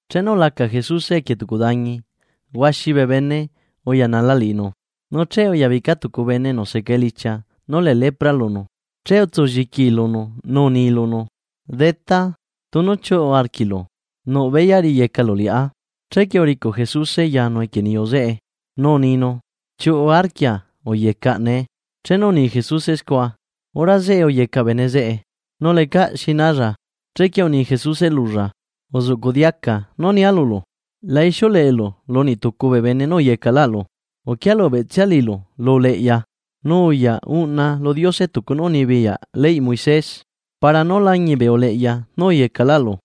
Chenu ulaca Jesuse equie tucu dañi, huaxi bee bene uyanala liꞌinu. Nu che uyabica tucu bene enu seca elichia nú lee lepra lunu, che utsu lliquii lunu nu uni lunu: ―Detá, tunu chiuꞌu arquiꞌlu, nuꞌ beyaꞌ riyecalu liꞌá. Chequie uricuꞌ Jesuse yanu equie niyu zeꞌe nu uninu: ―Chiuꞌu arquia uyecaꞌ nee. Chenu uni Jesuse scua, hora zeꞌe uyecaꞌ bene zeꞌe nu lecaꞌ xi nalla. Chequie uni Jesuse lulla: ―Uzuꞌcuꞌ diaca nú nia lulu, la ixiuleꞌelu lu niꞌtucu bee bene nú uyecaꞌlaꞌlu. Uquia lubeꞌtsia liꞌilu lu uleꞌya, nu uyaꞌ uꞌna lu Diose tucu nú unibiyaꞌ leyꞌ Moisés, para nú lañiꞌ bee uleꞌya nú uyecaꞌlu.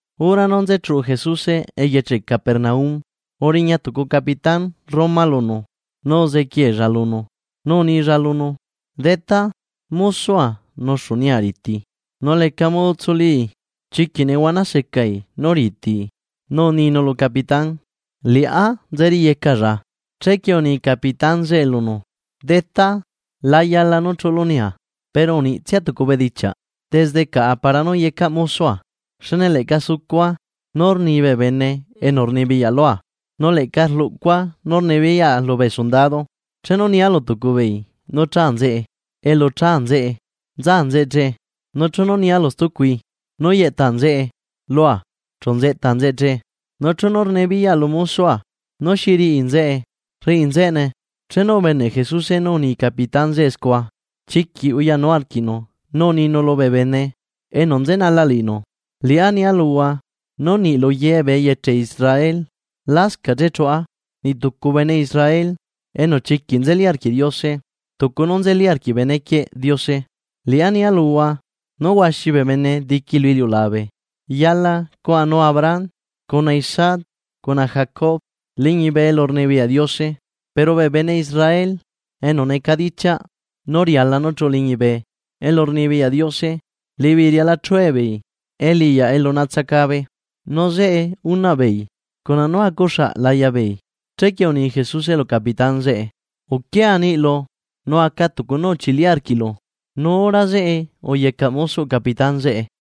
Hora nú nzechuꞌu Jesuse eyeche Capernaum, uriña tucu capitán Roma lunu nu uzequiella lunu, nu unilla lunu: ―Detá, mosoa nuxu nia riti nu lecaꞌ modo tsulii, chiquiꞌ nehuana secai nú ritii. Nu uninu lu capitán: ―Liꞌá nzeriyecalla. Chequie uni capitán zeꞌe lunu: ―Detá, la yala nú chuꞌulu nia. Pero uniꞌtsia tucu bedichiaꞌ desde caꞌa para nú yecaꞌ mosoa, xne leꞌca sucua nú rni bee bene enu rnibiyaꞌ lua, nu leꞌca rluꞌcua nú rnibiyaꞌa lubee sundado. Chenu nia lu tucu beei nú cha nzeꞌe elu cha nzeꞌe chu nza nzeꞌe che, nu chenu nia lu stucui nú yeꞌta nzeꞌe lua chu nzeꞌta nzeꞌe che, nu chenu rnibiyaꞌa lu mosoa nú xi riꞌi nzeꞌe, rriꞌi nzeꞌene. Chenu ubeneꞌ Jesuse nú uni capitán zeꞌe scua, chiquiꞌ uyanu arquiꞌnu nu uninu lubee bene enu nzenala liꞌinu: ―Liꞌá nia luhua nú niꞌ luye bee eyeche Israel lascaꞌ chechuꞌa niꞌ tucu bene Israel enu chiquiꞌ nzeli arquiꞌ Diose tucu nú nzeli arquiꞌ benequieꞌ Diose. Liꞌá nia luhua nú huaxi bee bene diqui lu iliulabe, yala cuaꞌanu Abraham, cuna Isaac cuna Jacob liñibe elurnibiyaꞌ Diose. Pero bee bene Israel enu necadichiaꞌ nú riala nú chuꞌu liñibe elurnibiyaꞌ Diose liꞌibeei riala chue beei eliꞌyaꞌ elu natsacabe, nu zeꞌe unaꞌbeei cuna nú acuxaꞌ laya beei. Chequie uni Jesuse lu capitán zeꞌe: ―Uquia niꞌlu, nu aca tucu nú uchili arquiꞌlu. Nu hora zeꞌe uyecaꞌ mosoꞌ capitán zeꞌe.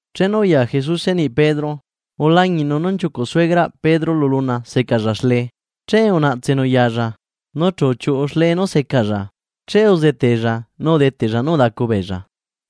Chenu uya Jesuse niꞌ Pedro, ulañiꞌnu nú nchiucuꞌ suegraꞌ Pedro lu luna seca xle. Che unaꞌtsenu yalla, nu chu uchiuꞌu xle nú secalla, che uzetella nu udeteꞌlla nú udacu beella.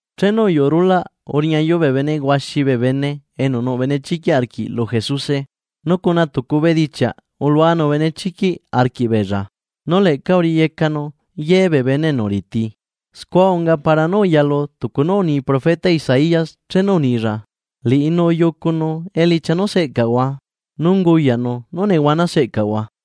Chenu uyuꞌu rulaꞌ, uriñayu bee bene huaxi bee bene enu nuꞌ benechiquiꞌ arquiꞌ lu Jesuse, nu cuna tucu bedichiaꞌ uluanu benechiquiꞌ arquiꞌbeella, nu leꞌca uriyecanu ye bee bene enu riti. Scua unga para nú uyalu tucu nú uni profeta Isaías chenu unilla: “Liꞌinu uyucunu elichia nú seꞌcaꞌahua nu unguyaꞌnu nú nehuana seꞌcaꞌahua.”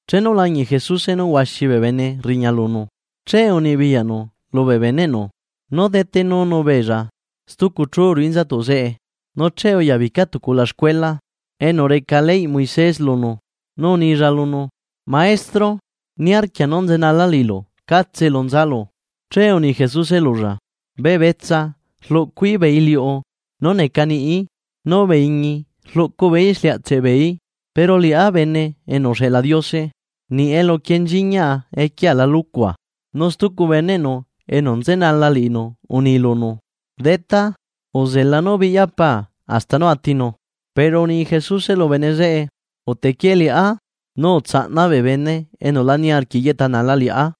Chenu ulañiꞌ Jesuse nú huaxi bee bene rriña lunu, che unibiyaꞌnu lubee beneꞌnu nú detenunu beella stucu chu ruꞌu inzatuꞌ zeꞌe. Nu che uyabica tucu ulaxcuela enu reca leyꞌ Moises lunu, nu unilla lunu: ―Maestro, niarquia nú nzelanala liꞌilu catse elu nzalu. Che uni Jesuse lulla: ―Bee betsa rluꞌcu beeí iliuꞌu nú neca niꞌi beeí, nu bee iñi rluꞌcu beeí exliaꞌtseꞌ beeí. Pero liꞌá Bene enu uxeꞌla Diose niꞌ elu quienchiñaꞌa equiea la lucua. Nu stucu beneꞌnu enu nzenala liꞌinu uni lunu: ―Detá, uzela nú biꞌya paa hasta nú atinu. Pero uni Jesuse lu bene zeꞌe: ―Utequie liꞌá, nu uzela nú bee bene enu la niarquiꞌ yeꞌtanala liꞌá,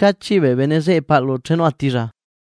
cachiꞌ bee nzeꞌe paꞌlu chenu atilla.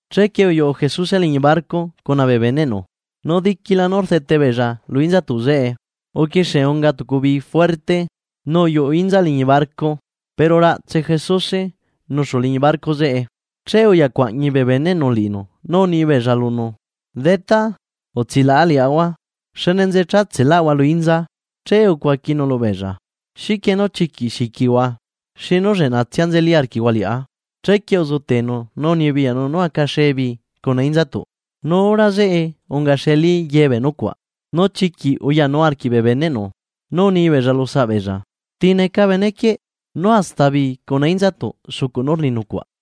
Chequie uyuꞌu Jesuse liñi barco cuna bee beneꞌnu, nu diquila nú rdete beella lu inzatuꞌ zeꞌe, uquixie unga tucu bii juerte nu uyuꞌu inza liñi barco. Pero raꞌtse Jesuse nuxu liñi barco zeꞌe. Che uya cuaꞌñi bee beneꞌnu liꞌinu nu uni beella lunu: ―¡Detá, utsilaꞌa liaꞌahua! ¡Xne nze chatseꞌlaꞌahua lu inza! Che ucuaquinu lubeella: ―¿Xiquie nú chiquiꞌ xiquihua? ¡Xinu lleꞌnatsia nzeli arquiꞌhua liꞌá! Chequie uzetenu nu unibiyaꞌnu nú acaxe bii cuna inzatuꞌ nu hora zeꞌe ungaxeli ye bee nucuaꞌ Nu chiquiꞌ uyanu arquiꞌ bee beneꞌnu nú unibeella lu saꞌ beella: ―¿Ti neca benequieꞌ?, nú hasta bii cuna inzatuꞌ sucuꞌ nú rni nucuaꞌ.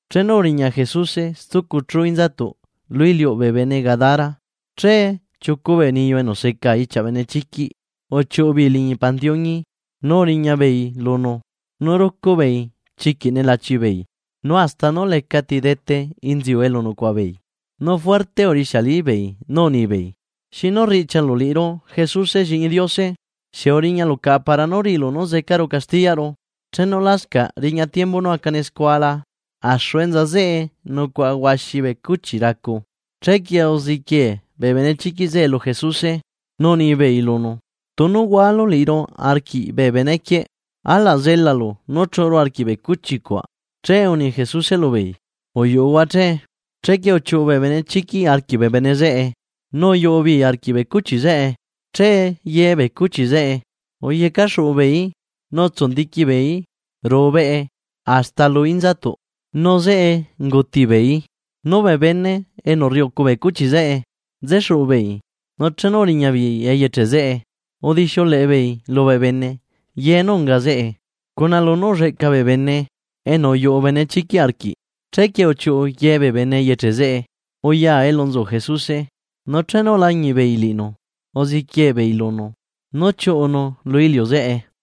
Chenu uriña Jesuse stucu chu inzatuꞌ lu iliuꞌ bee bene Gadara, che chiucu bee niyu enu seca ichiaꞌ benechiquiꞌ uchiuꞌu beei liñi pandiuñi nu uriña beei lunu. Nu rucu beei chiquiꞌ nelachi beei, nu hasta nú lecati dete inziu elu nucuaꞌa beei. Nu juerte urixialibeei nú unibeei: ―¿Xinu riꞌchialu liꞌiru Jesuse Lliꞌñi Diose? ¿Xieꞌ uriñalu caꞌa para nú riꞌilu nú zecaru castiyaꞌru chenu lascaꞌ riña tiembu nú acane scua la? Axu enza zeꞌe nucuaꞌa huaxi bee cuchi racu, chequie uziquie bee benechiquiꞌ zeꞌe lu Jesuse nú unibeei lunu: ―Tunu hualu liꞌiru arquiꞌ bee benequieꞌ, alaꞌ zelalu nú chuꞌuru arquiꞌ bee cuchi cuaꞌ. Che uni Jesuse lubeei: ―Uyuꞌuhua che. Chequie uchiuꞌu bee benechiquiꞌ arquiꞌ bee bene zeꞌe nu uyuꞌu beei arquiꞌ bee cuchi zeꞌe. Che ye bee cuchi zeꞌe uyecaxuꞌu beeí nu utsundiqui beeí ruꞌu beꞌe hasta lu inzatuꞌ, nu zeꞌe unguti beeí. Nu bee bene enu rriucu bee cuchi zeꞌe, nzexuꞌu beei, nu chenu uriña beei eyeche zeꞌe udixiuleꞌe beei lubee bene ye nú unga zeꞌe, cuna lunú ulleꞌca bee bene enu uyuꞌu benechiquiꞌ arquiꞌ. Chequie uchiuꞌu ye bee bene eyeche zeꞌe uya elu nzu Jesuse, nu chenu ulañiꞌ beei liꞌinu, uziquie beei lunu nú chiuꞌunu lu iliu zeꞌe.